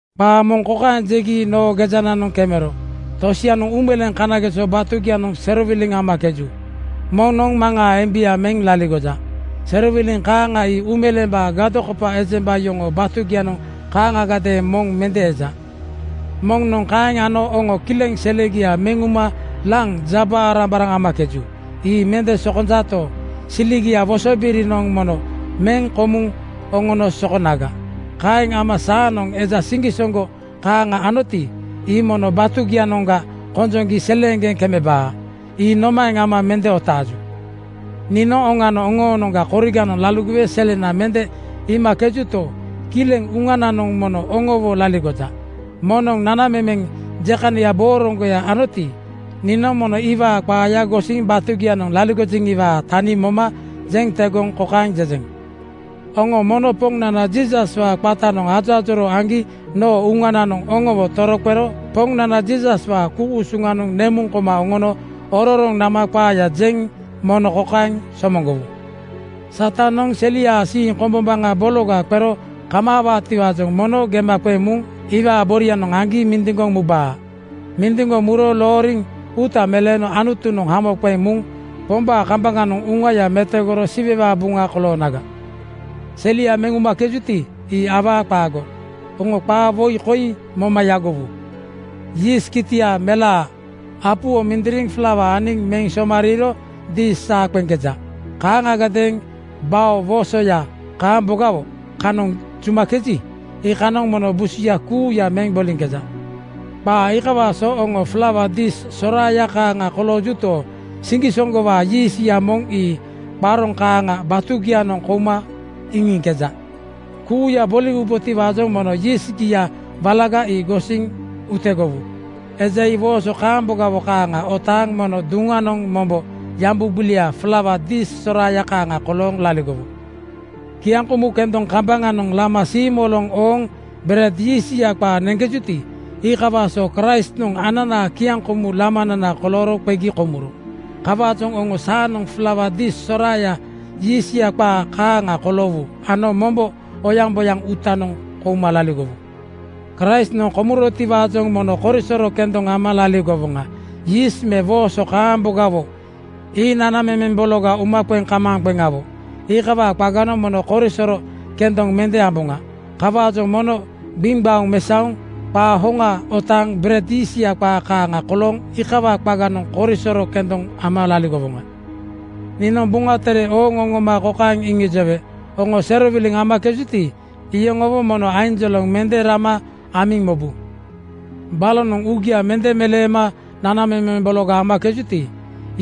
Qaa moŋ kokaeŋ jegi noo gejananoŋ kemero: Tosianoŋ uumeleeŋ kanageso batugianoŋ serowiliŋ amakeju. Moŋnoŋ maŋaa embia meŋ laligoja. Serowiliŋ kaaŋa ii uumeleembaa gadokopa ejemba yoŋoo batugianoŋ kaaŋagadeeŋ moŋ mende eja. Moŋnoŋ kaeŋ ano oŋo kileŋ selegia meŋ uma laŋ jaba-arambaraŋ amakeju. Ii mende sokonjato, siliaa wosobirinoŋ mono meŋ komuŋ oŋono sokonaga. Kaeŋ ama saanoŋ eja siŋgisoŋgo kaaŋa anoti, ii mono batugianoŋga konjoŋgi seleeŋgeŋ kamaabaa. Ii nomaeŋ ama mende otaaju? Niinoŋ oŋanoŋ oŋoonoŋga koriganoŋ laligowe selena mende iimakejuto, kileŋ uŋananoŋ mono oŋowo laligoja. Moŋnoŋ nanamemeŋ jekania booroŋgoya anoti, niinoŋ mono iwaa qaaya gosiŋ batugianoŋ laligojeŋiwaa tani moma jeŋ tegoŋ kokaeŋ jejeŋ: Oŋo mono Poŋnana Jiisaswaa qatanoŋ ajoajoroo aŋgi noo uŋananoŋ oŋowo toroqero Poŋnana Jiisaswaa ku-usuŋanoŋ nemuŋ koma oŋono ororoŋ nama qaaya jeŋ mono kokaeŋ somoŋgowu: Satanoŋ seliaa siiŋ kombombaŋa bologa qero kamaawaatiwaajoŋ mono gema qeŋ muŋ iwaa borianoŋ aŋgi mindiŋgoŋ mubaa. Mindiŋgoŋ muro looriŋ uuta meleeno Anutunoŋ hamo qeŋ muŋ Pombaa kambaŋanoŋ uŋaya metogoro Siwewaa buŋa koloonaga. Selegia meŋ umakejuti, ii awaa qaago. Oŋo qaa woi koi moma yagowu, “Yiist kitia melaa apuwo mindiriŋ flauanoŋ aniŋ meŋ somariiro dis saa qeŋkeja. Kaaŋagadeeŋ bao woosoya kaambogawo kanoŋ jumakeji, iikanoŋ mono busia kuuya meŋ boliŋkeja.” Qaa iikawaa so oŋo flaua dis soraaya kaaŋa koloogito, siŋgisoŋgowaa yiistya moŋ ii qaroŋ kaaŋa batugianoŋ kouma iŋiŋkeja. Kuuya boliwubotiwaajoŋ mono yiistgia walaga ii gosiŋ utegowu. Eja ii wooso kaambogawo kaaŋa otaaŋ mono duŋanoŋ mombo yambu gbiliaa flaua dis soraaya kaaŋa kolooŋ laligowu. Kiaŋkomu kendoŋ kambaŋanoŋ lama siimoloŋ ooŋ bered yiistya qaa neŋkejuti, iikawaa so Kraistnoŋ ananaa kiaŋkomu lamanana kolooro qegi komuro. Kawaajoŋ oŋo saanoŋ flaua dis soraaya yiistya qaa kaaŋa koloowu ano mombo oyaŋboyaŋ uutanoŋ kouma laligowu. Kraist komurotiwaajoŋ mono korisoro kendoŋ ama laligowoŋa. Yiist me wooso kaambogawo ii nanamemeŋ bologa umaqeŋkamaaŋqeŋawo. Iikawaa qaganoŋ mono korisoro kendoŋ mende amboŋa. Kawaajoŋ mono gbiŋgbaoŋ mesaoŋ qaa hoŋa otaaŋ bered yiistya qaa kaaŋa kolooŋ iikawaa qaganoŋ korisoro kendoŋ ama laligowoŋa. Niinoŋ Buŋa Tere ooŋ oŋoma kokaeŋ iŋijowe: Oŋo serowiliŋ amakejuti, iyoŋowo mono ainjoloŋ mende rama amiŋ mobu. Balonoŋ uugia mende meleema nanamemeŋ bologa amakejuti,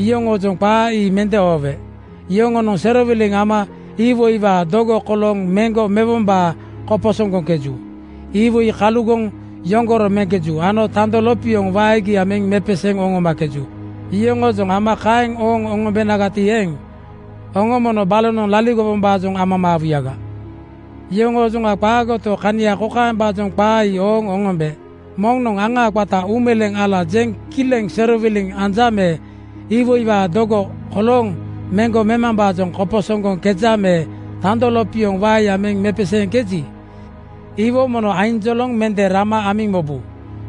iyoŋoojoŋ qaa ii mende oowe. Yoŋonoŋ serowiliŋ ama iwoiwaa dogo kolooŋ meŋgo mewombaajoŋ koposoŋgoŋkeju. Iwoi kalugoŋ yoŋgoro meŋkeju ano tando lopioŋ waegia meŋ mepeseeŋ oŋomakeju. Yoŋoojoŋ ama kaeŋ ooŋ oŋombenagati eeŋ, oŋo mono balonoŋ laligowombaajoŋ amamaawuyaga. Yoŋoojoŋa qaagoto, kania kokaembaajoŋ qaa ii ooŋ oŋombe: Moŋnoŋ aŋaa qata uumeleeŋ ala jeŋ kileŋ serowiliŋ anja me iwoiwaa dogo kolooŋ meŋgo memambaajoŋ koposoŋgoŋkeja me tando lopioŋ waeya meŋ mepeseeŋkeji, iwo mono ainjoloŋ mende rama amiŋ mobu.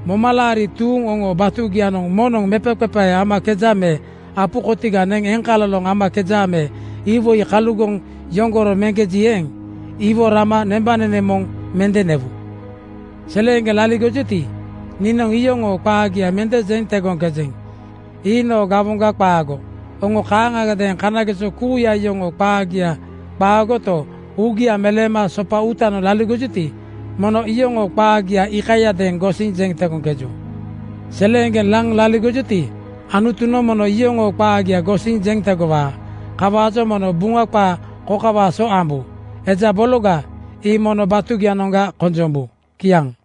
Momalaari tuuŋ oŋoo batugianoŋ moŋnoŋ mepaqepae amakeja me apu kotiga neŋ eŋkaloloŋ amakeja me iwoi kalugoŋ yoŋgoro meŋkeji eeŋ, iwo rama nembanene moŋ mende newu. Seleeŋgeŋ laligojuti, niinoŋ iyoŋoo qaagia mende jeŋ tegoŋkejeŋ. Ii noo gawoŋga qaago. Oŋo kaaŋagadeeŋ kanageso kuuya yoŋoo qaagia qaagoto, uugia meleema sopa uutanoŋ laligojuti, mono iyoŋoo qaagia iikayadeeŋ gosiŋ jeŋ tegoŋkeju. Seleeŋgeŋ laŋ laligojuti, Anutunoŋ mono iyoŋoo qaagia gosiŋ jeŋ tegowaa. Kawaajoŋ mono Buŋa qaa kokawaa so ambu, “Eja bologa ii mono batugianoŋga konjombu.” Kiaŋ.